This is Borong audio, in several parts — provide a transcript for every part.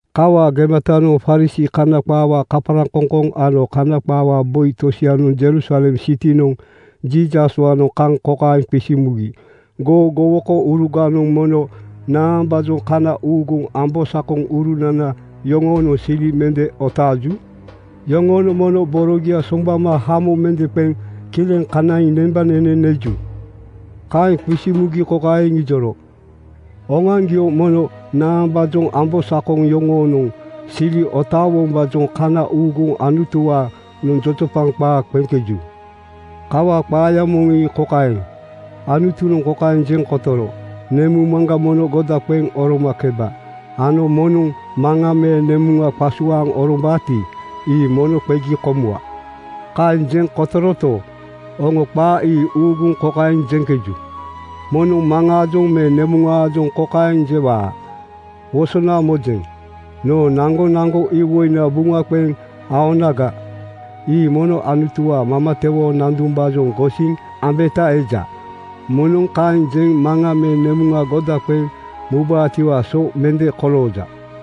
Kawaa gematanoŋ Farisii (Kana qaawaa kaparaŋkoŋkoŋ) ano Kana qaawaa boi tosianoŋ Jerusalem sitinoŋa Jiisaswaanoŋ kaŋ kokaeŋ qisiŋ mugi, “Goo gowokouruganoŋ mono naambaajoŋ kana uuguŋ ambosakoŋurunana yoŋoonoŋ sili mende otaaju? Yoŋonoŋ mono borogia soŋgbama hamo mende qeŋ kileŋ kanaiŋ nembanene neju?” Kaeŋ qisiŋ mugi kokaeŋ iŋijoro, “Oŋoaŋgio mono naambaajoŋ ambosakonana yoŋoonoŋ sili otaawombaajoŋ kana uuguŋ Anutuwaanoŋ jojopaŋ qaa qeŋkeju? Kawaa qaaya moŋ ii kokaeŋ: Anutunoŋ kokaeŋ jeŋ kotoro, ‘Nemuŋ maŋga mono goda qeŋ oromakeba,’ ano ‘Moŋnoŋ maŋa me nemuŋa qasuaaŋ orombaati, ii mono qegi komuwa.’ “Kaeŋ jeŋ kotoroto, oŋo qaa ii uuguŋ kokaeŋ jeŋkeju, ‘Moŋnoŋ maŋaajoŋ me nemuŋaajoŋ kokaeŋ jewaa: Wosona mojeŋ. Noo naŋgonaŋgo iwoina buŋa qeŋ aonaga, ii mono Anutuwaa mamatewoo nandumbaajoŋ gosiŋ ambeta eja. Moŋnoŋ kaeŋ jeŋ maŋa me nemuŋa goda qeŋ mubaatiwaa so mende kolooja.’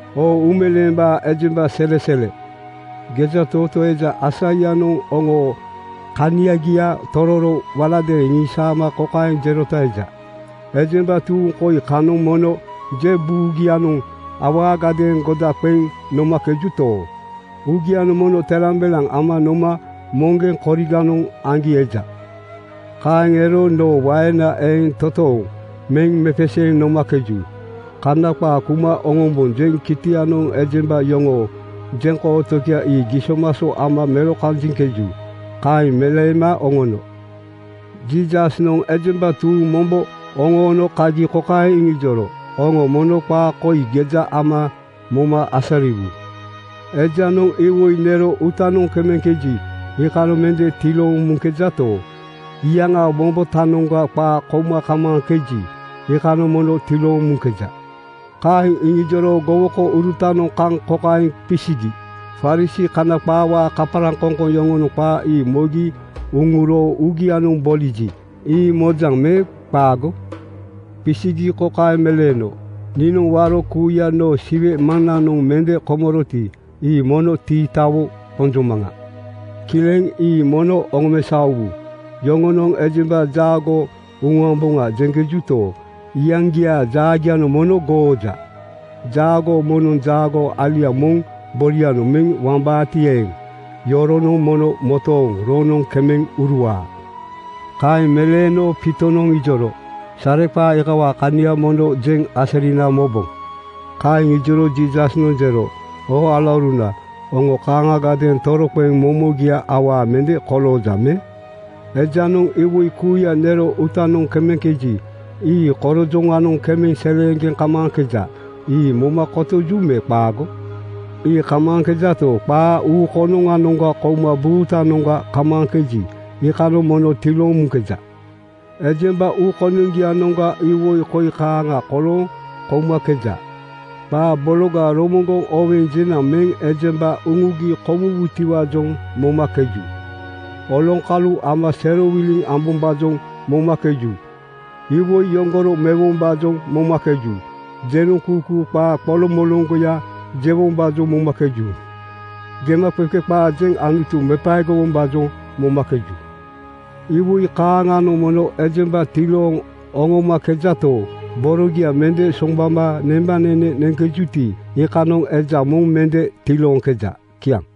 Oo uumeleembaa ejemba selesele, gejatootoo eja Aisaianoŋ oŋoo kaniagia tororo waladeeŋ iŋisaama kokaeŋ jerota eja, ‘Ejemba tuuŋ koi kanoŋ mono je buugianoŋ awaagadeeŋ goda qeŋ nomakejuto, uugianoŋ mono telambelaŋ ama noma moŋgeŋ koriganoŋ aŋgi eja. “Kaeŋ ero noo waena eeŋ toontooŋ meŋ mepeseeŋ nomakeju. Kana qaa kuma oŋombonjeŋ kitianoŋ ejemba yoŋoo jeŋkootogia ii gisomaso ama melokanjiŋkeju.” ’ Kaeŋ meleema oŋono. Jiisasnoŋ ejemba tuuŋ mombo oŋoono kagi kokaeŋ iŋijoro, “Oŋo mono qaa koi geja ama moma asariwu. Ejanoŋ iwoi nero uutanoŋ kemeŋkeji, iikanoŋ mende tilooŋ muŋkejato, iyaŋaa wombotanoŋga qaa kouma kamaaŋkeji, iikanoŋ mono tilooŋ muŋkeja.” Kaeŋ iŋijoro gowokourutanoŋ kaŋ kokaeŋ qisigi, “Farisii (Kana qaawaa kaparaŋkoŋkoŋ) yoŋonoŋ qaa ii mogi uŋuro uugianoŋ boliji, ii mojaŋ me qaago?” Qisigi kokaeŋ meleeno, “Niinoŋ waro kuuya noo Siwe Maŋnanoŋ mende komoroti, ii mono tiitawo qonjomaŋa. Kileŋ, ii mono oŋomesaowu. Yoŋonoŋ ‘Ejemba jaagoo uŋuamboŋa,’ jeŋkejuto, iyaŋgiaa jaagianoŋ mono gooja. Jaagoo moŋnoŋ jaagoo alia moŋ borianoŋ meŋ wambaati eeŋ, iyoronoŋ mono motooŋ roŋnoŋ kemeŋ uruwaa.” Kaeŋ meleeno Piitonoŋ ijoro, “Sareqaa iikawaa kania mono jeŋ asarina moboŋ.” Kaeŋ ijoro Jiisasnoŋ jero, “Oo alauruna, oŋo kaaŋagadeeŋ toroqeŋ momogia awaa mende kolooja me? Ejanoŋ iwoi kuuya nero uutanoŋ kemeŋkeji, ii korojoŋanoŋ kemeŋ seleeŋgeŋ kamaaŋkeja. Ii moma kotoju me qaago? “Ii kamaaŋkejato, qaa uu konoŋanoŋga kouma buutanoŋga kamaaŋkeji, iikanoŋ mono tilooŋ muŋkeja. Ejemba uu konoŋgianoŋga iwoi koi kaaŋa kolooŋ koumakeja: Qaa bologa romoŋgoŋ oweŋ jenaŋ meŋ ejemba uŋugi komuwutiwaajoŋ momakeju. Oloŋkalu ama serowiliŋ ambombaajoŋ momakeju. Iwoi yoŋgoro mewombaajoŋ momakeju. Jenoŋkuukuu qaa qoloŋmoloŋgoya jewombaajoŋ momakeju. Gemaqeqe qaa jeŋ Anutu mepaegowombaajoŋ momakeju. Iwoi kaaŋanoŋ mono ejemba tilooŋ oŋomakejato, borogia mende soŋgbama nembanene neŋkejuti, iikanoŋ eja moŋ mende tilooŋkeja.” Kiaŋ.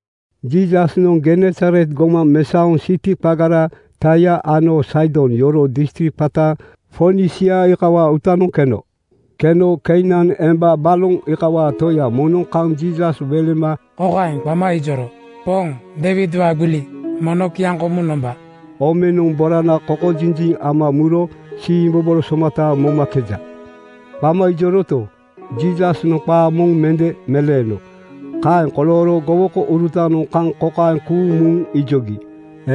Jiisasnoŋ Genesaret gomaŋ mesaoŋ siti qagara Taia ano Saidon yoroo distrik qata Fonisia iikawaa uutanoŋ keno. Keno Keinan emba, baloŋ iikawaa toya moŋnoŋ kaŋ Jiisas welema kokaeŋ qama ijoro, “Poŋ, Deiwidwaa gbili, mono kiaŋkomuŋ nomba! Omenoŋ borana kokojinjiŋ ama muro siimbobolo somata momakeja.” Qama ijoroto, Jiisasnoŋ qaa moŋ mende meleeno. Kaeŋ kolooro gowokourutanoŋ kaŋ kokaeŋ kuuŋ muŋ ijogi,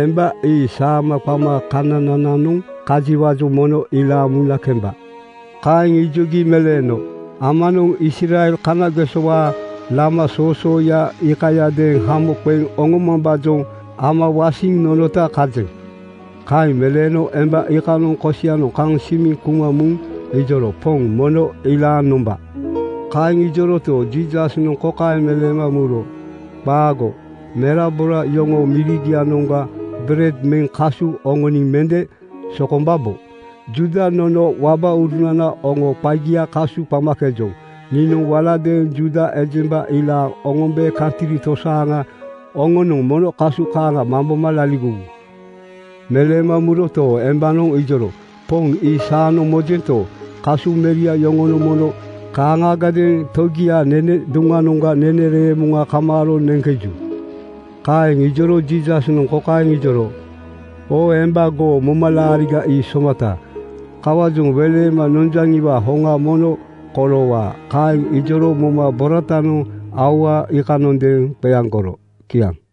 “Emba ii saama qama kananananoŋ kajiwaajoŋ mono ilaaŋ muna kemba.” Kaeŋ ijogi meleeno, “Amananoŋ Israel kanagesowaa lama soosooya iikayadeeŋ hamo qeŋ oŋomambaajoŋ ama wasiŋ nonota kajeŋ.” Kaeŋ meleeno emba iikanoŋ kosianoŋ kaŋ simiŋ kuma muŋ ijoro, “Poŋ, mono ilaaŋ nomba!” Kaeŋ ijoroto, Jiisasnoŋ kokaeŋ meleema muro, “Qaago, merabora yoŋoo mirigianoŋga bered meŋ kasu oŋoniŋ mende sokombabo. Juuda nono wabaurunana oŋoo qagia kasu qamakejoŋ. Niinoŋ waladeeŋ Juuda ejemba ilaaŋ oŋombe kantri tosaaŋa oŋonoŋ mono kasu kaaŋa mamboma laligowu.” Meleema muroto, embanoŋ ijoro, “Poŋ, ii saanoŋ mojento, kasu meria yoŋonoŋ mono kaaŋagadeeŋ togiaa nene duŋnoŋga nene reemoŋa kamaaro neŋkeju.” Kaeŋ ijoro Jiisasnoŋ kokaeŋ ijoro, “Oo emba, goo momalaariga ii somata. Kawaajoŋ welema nonjaŋiwaa hoŋa mono koloowaa.” Kaeŋ ijoro moma boratanoŋ aua iikanondeeŋ qeaŋgoro. Kiaŋ.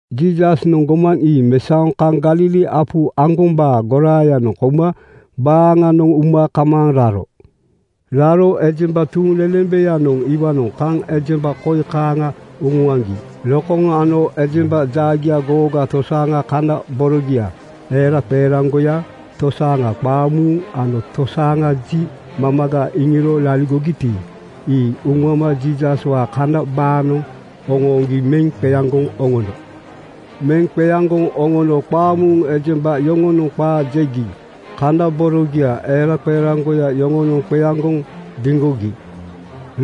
Jiisasnoŋ gomaŋ ii mesaoŋ kaŋ Galili apu aŋgombaa goraayanoŋ kouma baaŋanoŋ uma kamaaŋ raro. Raro ejemba tuuŋlelembeyanoŋ iwaanoŋ kaŋ ejemba koi kaaŋa uŋuaŋgi: Lokoŋ ano ejemba jaagia googa, tosaaŋa kana borogia eraqeeraŋgoya, tosaaŋa qaamuuŋ ano tosaaŋa ji mamaga iŋiro laligogiti, ii uŋuama Jiisaswaa kana banoŋ oŋooŋgi meŋ qeaŋgoŋ oŋono. Meŋ qeaŋgoŋ oŋono qaamuuŋ ejemba yoŋonoŋ qaa jegi kana borogia eraqeeraŋgoya yoŋonoŋ qeaŋgoŋ diŋgogi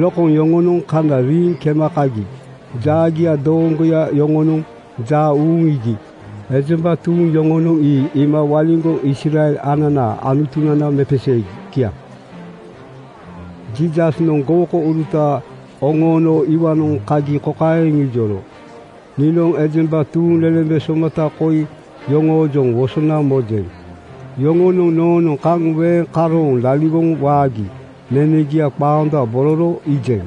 lokoŋ yoŋonoŋ kana riiŋ kema kagi jaagia dooŋgoya yoŋonoŋ jaa uuŋ iigi ejemba tuuŋ yoŋonoŋ ii iima waliŋgoŋ Israel ananaa Anutunana mepeseegi. Kiaŋ. Jiisasnoŋ gowokouruta oŋoono iwaanoŋ kagi kokaeŋ iŋijoro, “Niinoŋ ejemba tuuŋlelembe somata koi yoŋoojoŋ wosona mojeŋ. Yoŋonoŋ noonoŋ kaŋ weeŋ karooŋ laligoŋ waagi nenegia qaondabororo iijeŋ.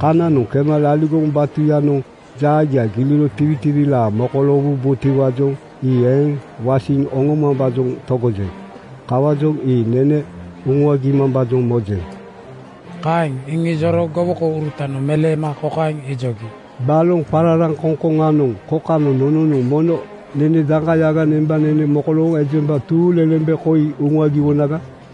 Kananoŋ kema laligoŋ batuyanoŋ jaagia giliro tiwitiwilaa mokoloowubotiwaajoŋ ii eeŋ wasiŋ oŋomambaajoŋ togojeŋ. Kawaajoŋ ii nene uŋuagimambaajoŋ mojeŋ.” Kaeŋ iŋijoro gowokourutanoŋ meleema kokaeŋ ijogi, “Baloŋ qararaŋkoŋkoŋanoŋ kokanoŋ nononoŋ mono daeŋkayaga nembanene mamaga mokolooŋ ejemba tuuŋlelembe koi uŋuagiwonaga?”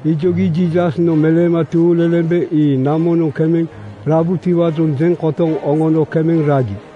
Ijogi Jiisasnoŋ ejemba tuuŋlelembe ii namonoŋ kemeŋ rabutiwaajoŋ jeŋ kotoŋ oŋono kemeŋ ragi.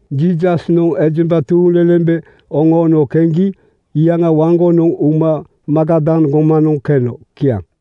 Jiisasnoŋ ejemba tuuŋlelembe oŋoono keŋgi iyaŋa waŋgonoŋ uma Magadan gomanoŋ keno. Kiaŋ.